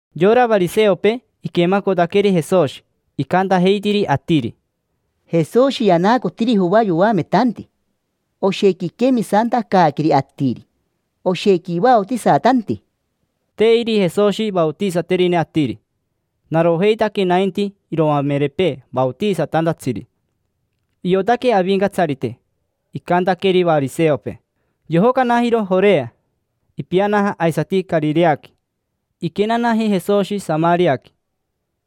Yora variseopee iquemacotaqueri Jesoshi, icantajeitiri atiri: —Jesoshi yanaacotiri Joa yoametanti. Oshequi iquemisantacaaqueri atiri, oshequi ivaotisatanti. Te iri Jesoshi vaotisaterine atiri, narojeitaque nainti iroamerepee vaotisatantatsiri. Iotaque Avincatsarite icantaqueri variseopee, yojocanajiro Jorea, ipianaja aisati Carireaqui. Iquenanaji Jesoshi Samariaqui,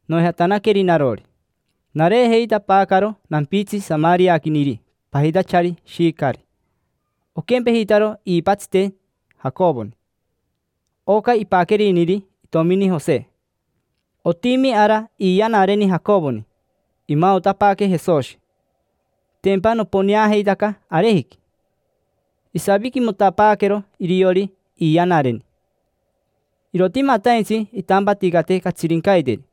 noijatanaqueri narori. Nareejeitapaacaro nampitsi samariaquiniri pajitachari Shicari. Oquempejitaro iipatsiteni Jacovoni: oca ipaqueriniri itomini Jose. Otimi ara iiyanareni Jacovoni. Imaotapaaque Jesoshi, tempa noponeajeitaca arejiqui. Isaviquimotapaaquero iriori iiyanareni. Irotimataintsi intampaticate catsirincaiteri.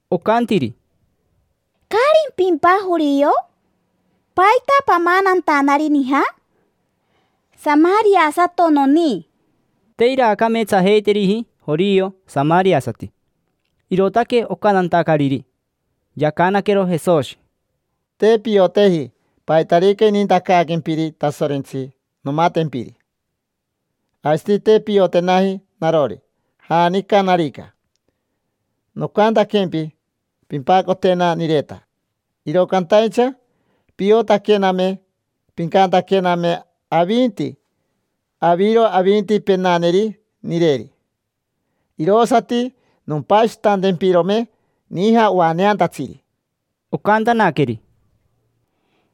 Ocantiri: —¿Caarimpimpa jorio? ¿Paita pamanantanari nija? Samariasato noni. Te iraacameetsajeiteriji jorio samariasati, irootaque ocantantacariri. Yacanaquero Jesoshi: —Te pioteji paitarica inintacaaquempiri Tasorentsi nomatempiri. Aisati te piotenaji narori, janicanarica. Nocantaquempi: “Pimpacotena nireta”. Iro cantaincha piotaquename, pincantaquename avinti: “Aviro avinti penaneri nireri”. Irosati nompashitantempirome nija oaneantatsiri. Ocantanaqueri: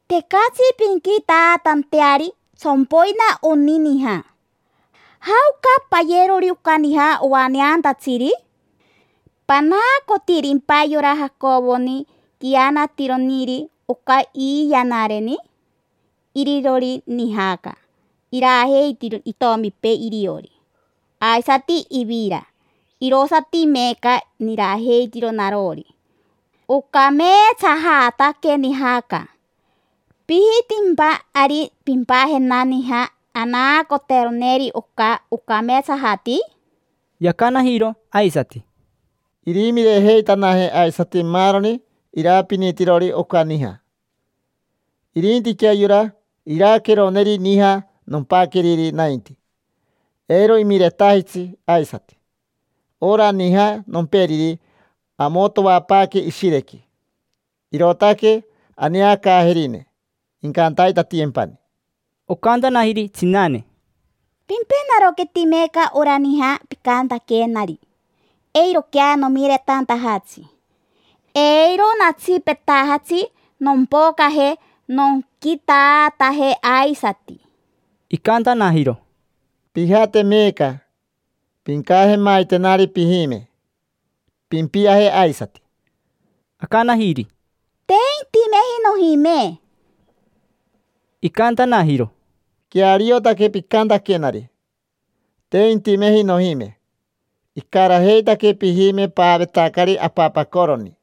—Tecatsi pinquitaatanteari. Tsompoina oni nija. ¿Jaoca payerori oca nija ovaneantatsiri? ¿Panaacotirimpa yora Jacovoni, quianatironiri oca iiyanareni? Irironi nijaca, irajeitironi itomipee iriori, aisati ivira. Irosati meeca nirajeitiro narori. Ocameetsajataque nijaca: ¿pijitimpa ari pimpajena nija anaacoteroneri oca ocameetsajati? Yacanajiro aisati: —Irimirejeitanaje aisati maaroni irapinitirori oca nija. Irintiquea yora iraqueroneri nija nompaqueriri nainti: eiro imiretajitsi aisati. Ora nija nomperiri amotoapaaque ishirequi, irootaque aneacaajerine incantaitatiyempani. Ocantanajiri tsinane: —Pimpenaroqueti meeca ora nija picantaquenari, eiroquea nomiretantajatsi. Eiro natsipetajatsi nompocaje nonquitaataje aisati. Icantanajiro: —Pijate meeca, pincajemaitenari pijime, pimpiaje aisati. Acanajiri: —Te intimeji nojime. Icantanajiro: —Queariotaque picantaquenari: “Te intimeji nojime”. Icarajeitaque pijime paavetacari apapacoroni.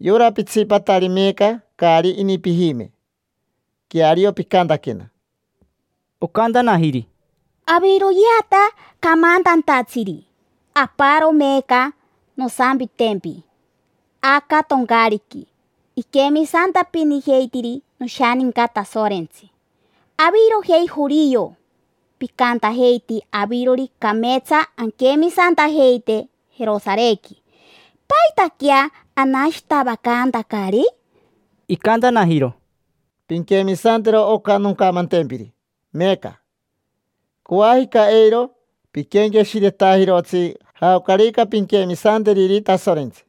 Yora pitsipatari meeca caari ini pijime. Queario picantaquena. Ocantanajiri: —Aviroyeata camantantatsiri: aparo meeca nosampitempi. Aca toncaariqui iquemisantapinijeitiri noshaninca Tasorentsi. Avirojei jorio, picantajeiti avirori cameetsa anquemisantajeite Jerosarequi. ¿Paitaquea anashitavacantacari? Icantanajiro: —Pinquemisantero oca noncamantempiri meeca. Coajica eiro piquenqueshiretajirotsi jaocarica pinquemisanteriri Tasorentsi.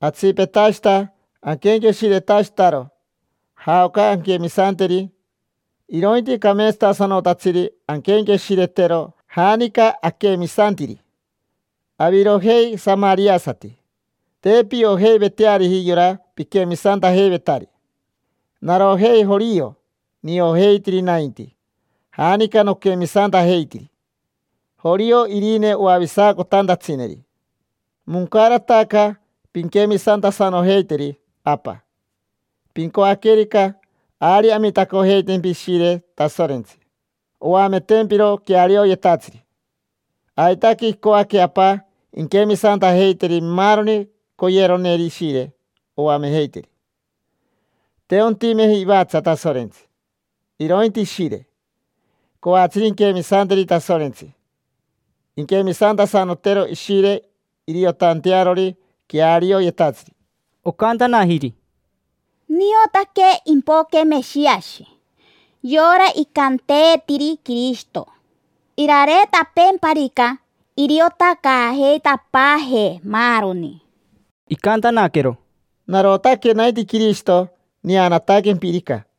Atsipetashita aquenqueshiretashitaro jaoca anquemisanteri, irointi cameetsatasanotatsiri anquenqueshiretero janica aquemisantiri. Avirojei samariasati te piojeiveteariji yora piquemisantajeivetari. Narojei, jorio, niojeitiri nainti janica noquemisantajeitiri. Jorio irine oavisacotantatsineri. Moncarataca pinquemisantasanojeiteri Apa: pincoaquerica, ari amitacojeitempi Ishire Tasorentsi, oametempiro quearioyetatsiri. Aitaque icoaque Apa inquemisantajeiteri maaroni coyeroneri Ishire oamejeiteri. Te ontimeji ivatsa Tasorentsi, irointi Ishire. Coatsiri inquemisanteri Tasorentsi inquemisantasanotero Ishire iriotantearori quearioyetatsiri. Ocantanajiri: —Niotaque impoque Meshiashi, yora icanteetiri Quirishito. Irareetapeemparica iriotacaajeitapaajee maaroni. Icantanaquero: —Narotaque nainti Quirishito neanataquempirica.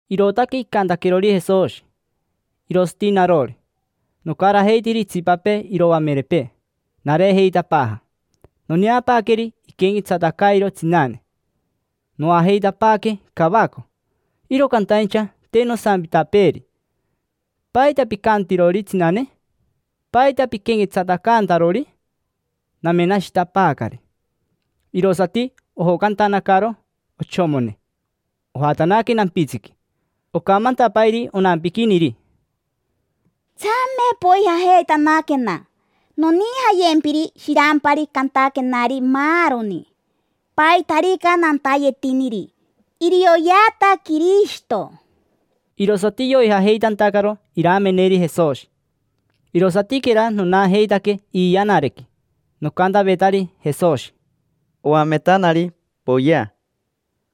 Irootaque icantaquerori Jesoshi. Irosati narori, nocarajeitiri itsipapee iroamerepee, nareejeitapaaja. Noneapaaqueri iquenquetsatacairo tsinane, noajeitapaaque cavaco. Iro cantaincha te nosampitapeeri: “¿Paita picantirori tsinane? ¿Paita piquenquetsatacantarori?” Namenashitapaacari. Irosati ojocantanacaro ochomone, ojatanaque nampitsiqui. Ocamantapairi onampiquiniri: —Tsame, poijajeitanaquena. Nonijayempiri shirampari cantaquenari maaroni, paitarica nantayetiniri. Irioyeata Quirishito. Irosati yoijajeitantacaro irameneri Jesoshi. Irosatiquera nonajeitaque iiyanareniqui, nocantavetari Jesoshi: —Oametanari, poyea.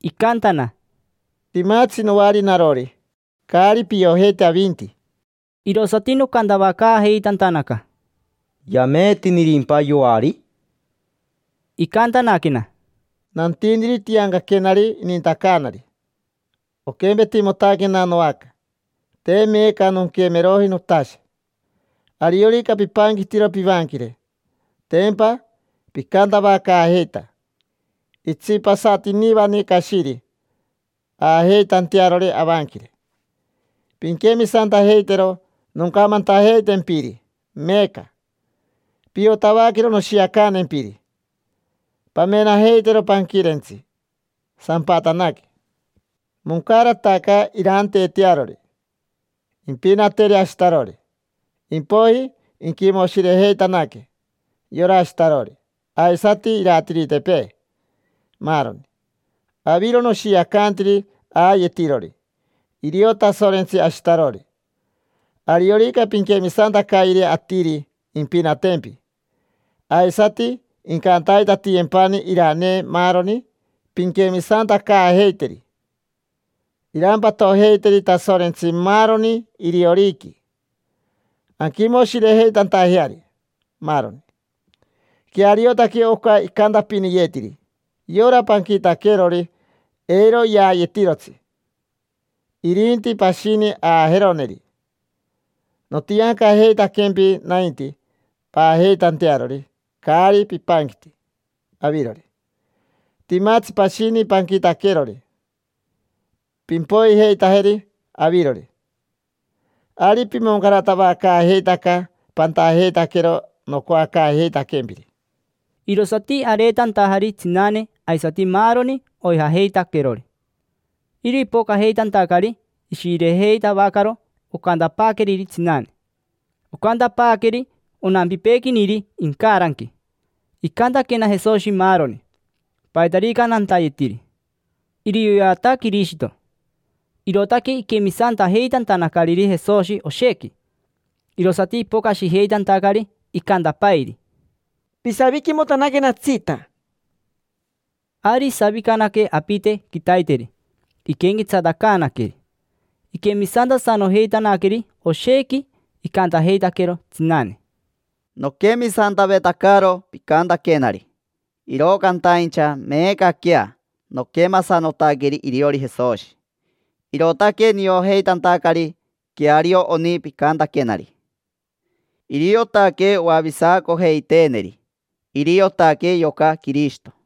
Icantana: —Timatsi noari narori caari piojeiti avinti. Irosati nocantavacaajeitantanaca: —¿Yameetinirimpa yoari? Icantanaquena: —Nantiniri tiancaquenari inintacaanari: oquempetimotaquena noaca, te meeca nonquemeroji notashe. Ariorica pipanquitiro pivanquire, tempa picantavacaajeita: “Itsipasatinivani cashiri aajeitantearori avanquire”. Pinquemisantajeitero noncamantajeitempiri meeca: piotavaquero noshiacantempiri. Pamenajeitero panquirentsi: sampatanaque, moncarataca iraanteetearori. Impinateri ashitarori, impoiji inquimoshirejeitanaque: yora ashitarori, aisati iratiritepee, maaroni. Aviro noshiacantiri aayetirori, irio Tasorentsi ashitarori. Ariorica pinquemisantacayeri atiri impinatempi, aisati incantaitatiyempani iranee maaroni pinquemisantacaajeiteri. Irampatojeiteri Tasorentsi maaroni irioriqui, anquimoshirejeitantajeari, maaroni. Queariotaque oca icantapiniyeetiri: “Yora panquitaquerori, eiro yaayetirotsi; irinti pashini aajeroneri”. Notiancajeitaquempi nainti paajeitantearori caari pipanquiti avirori. Timatsi pashini panquitaquerori, pimpoijeitajeri avirori. Ari pimoncaratavacaajeitaca pantajeitaquero nocoacaajeitaquempiri. Irosati areetantajari tsinane aisati maaroni oijajeitaquerori. Iro ipocajeitantacari ishirejeitavacaro ocantapaaqueriri tsinane. Ocantapaaqueri onampipeequiniri incaranqui: “Icantaquena Jesoshi maaroni, paitarica nantayetiri: irioyeata Quirishito”. Irootaque iquemisantajeitantanacariri Jesoshi oshequi. Irosati ipocashijeitantacari, icantapairi: —Pisaviquimotanaquenatsita. Ari isavicanaque apite quitaiteri, iquenquetsatacaanaqueri. Iquemisantasanojeitanaqueri oshequi. Icantajeitaquero tsinane: —Noquemisantavetacaro picantaquenari, iro cantaincha meecaquea noquemasanotaqueri iriori Jesoshi, irootaque niojeitantacari queario oni picantaquenari. Iriotaque oavisacojeiteeneri. Iriotaque yoca Quirishito.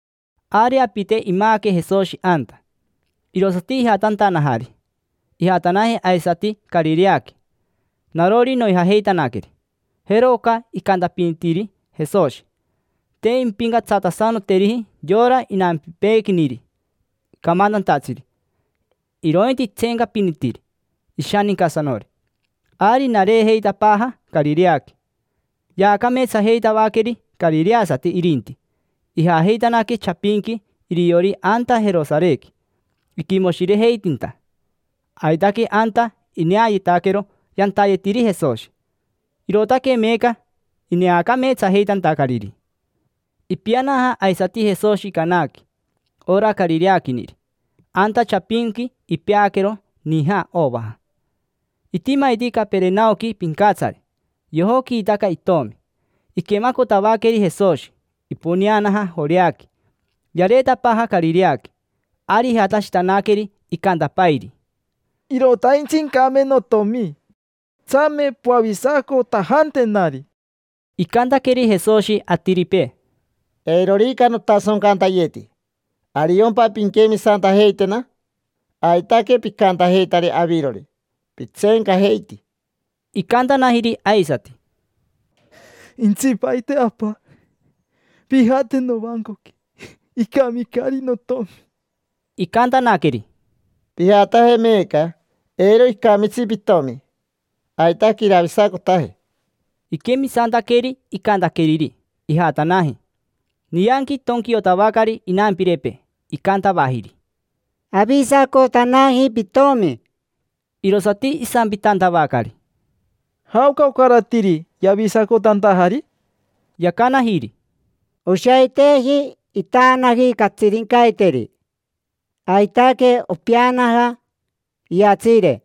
Ari apite imaaque Jesoshi anta, irosati ijatantanajari. Ijatanaji aisati Carireaqui. Narori, noijajeitanaqueri. Jero oca icantapinitiri Jesoshi: “Te impincatsatasanoteriji yora inampipeequiniri camantantatsiri, irointi itseencapinitiri ishanincasanori”. Ari nareejeitapaaja Carireaqui. Yaacameetsajeitavaqueri carireasati irinti. Ijajeitanaque chapinqui iriori anta Jerosarequi, iquimoshirejeitinta. Aitaque anta ineayetaquero yantayetiri Jesoshi. Irootaque meeca ineacameetsajeitantacariri. Ipianaja aisati Jesoshi Canaqui: ora carireaquiniri. Anta chapinqui ipeaquero nija ovaja. Itimaiti Caperenaoqui pincatsari, yojoquiitaca itomi. Iquemacotavaqueri Jesoshi, iponeanaja Joreaqui, yareetapaaja Carireaqui. Ari ijatashitanaqueri, icantapairi: —Irotaintsi incame notomi. Tsame poavisacotajantenari. Icantaqueri Jesoshi atiripee: —Eirorica notasoncantayeti, ¿ariompa pinquemisantajeitena? Aitaque picantajeitari avirori, pitseencajeiti. Icantanajiri aisati: —Intsipaite apa, pijate novancoqui. Icamicari notomi. Icantanaqueri: —Pijataje meeca. Eiro icamitsi pitomi, aitaque iravisacotaje. Iquemisantaqueri icantaqueriri, ijatanaji. Nianqui itonquiotavacari inampirepee, icantavajiri: —Avisacotanaji pitomi. Irosati isampitantavacari: —¿Jaoca ocaratiri yavisacotantajari? Yacanajiri: —Oshaiteji, itaanaji catsirincaiteri, aitaque opeanaja iyatsiire.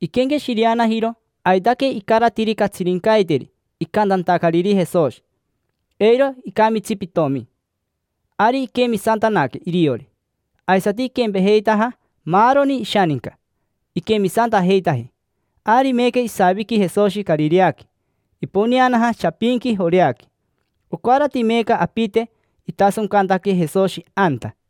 Iquenqueshireanajiro aitaque icaratiri catsirincaiteri icantantacariri Jesoshi: “Eiro icamitsi pitomi”. Ari iquemisantanaque iriori. Aisati iquempejeitaja maaroni ishaninca, iquemisantajeitaji. Ari meeca isaviqui Jesoshi Carireaqui, iponeanaja chapinqui Joreaqui. Ocarati meeca apite itasoncantaque Jesoshi anta.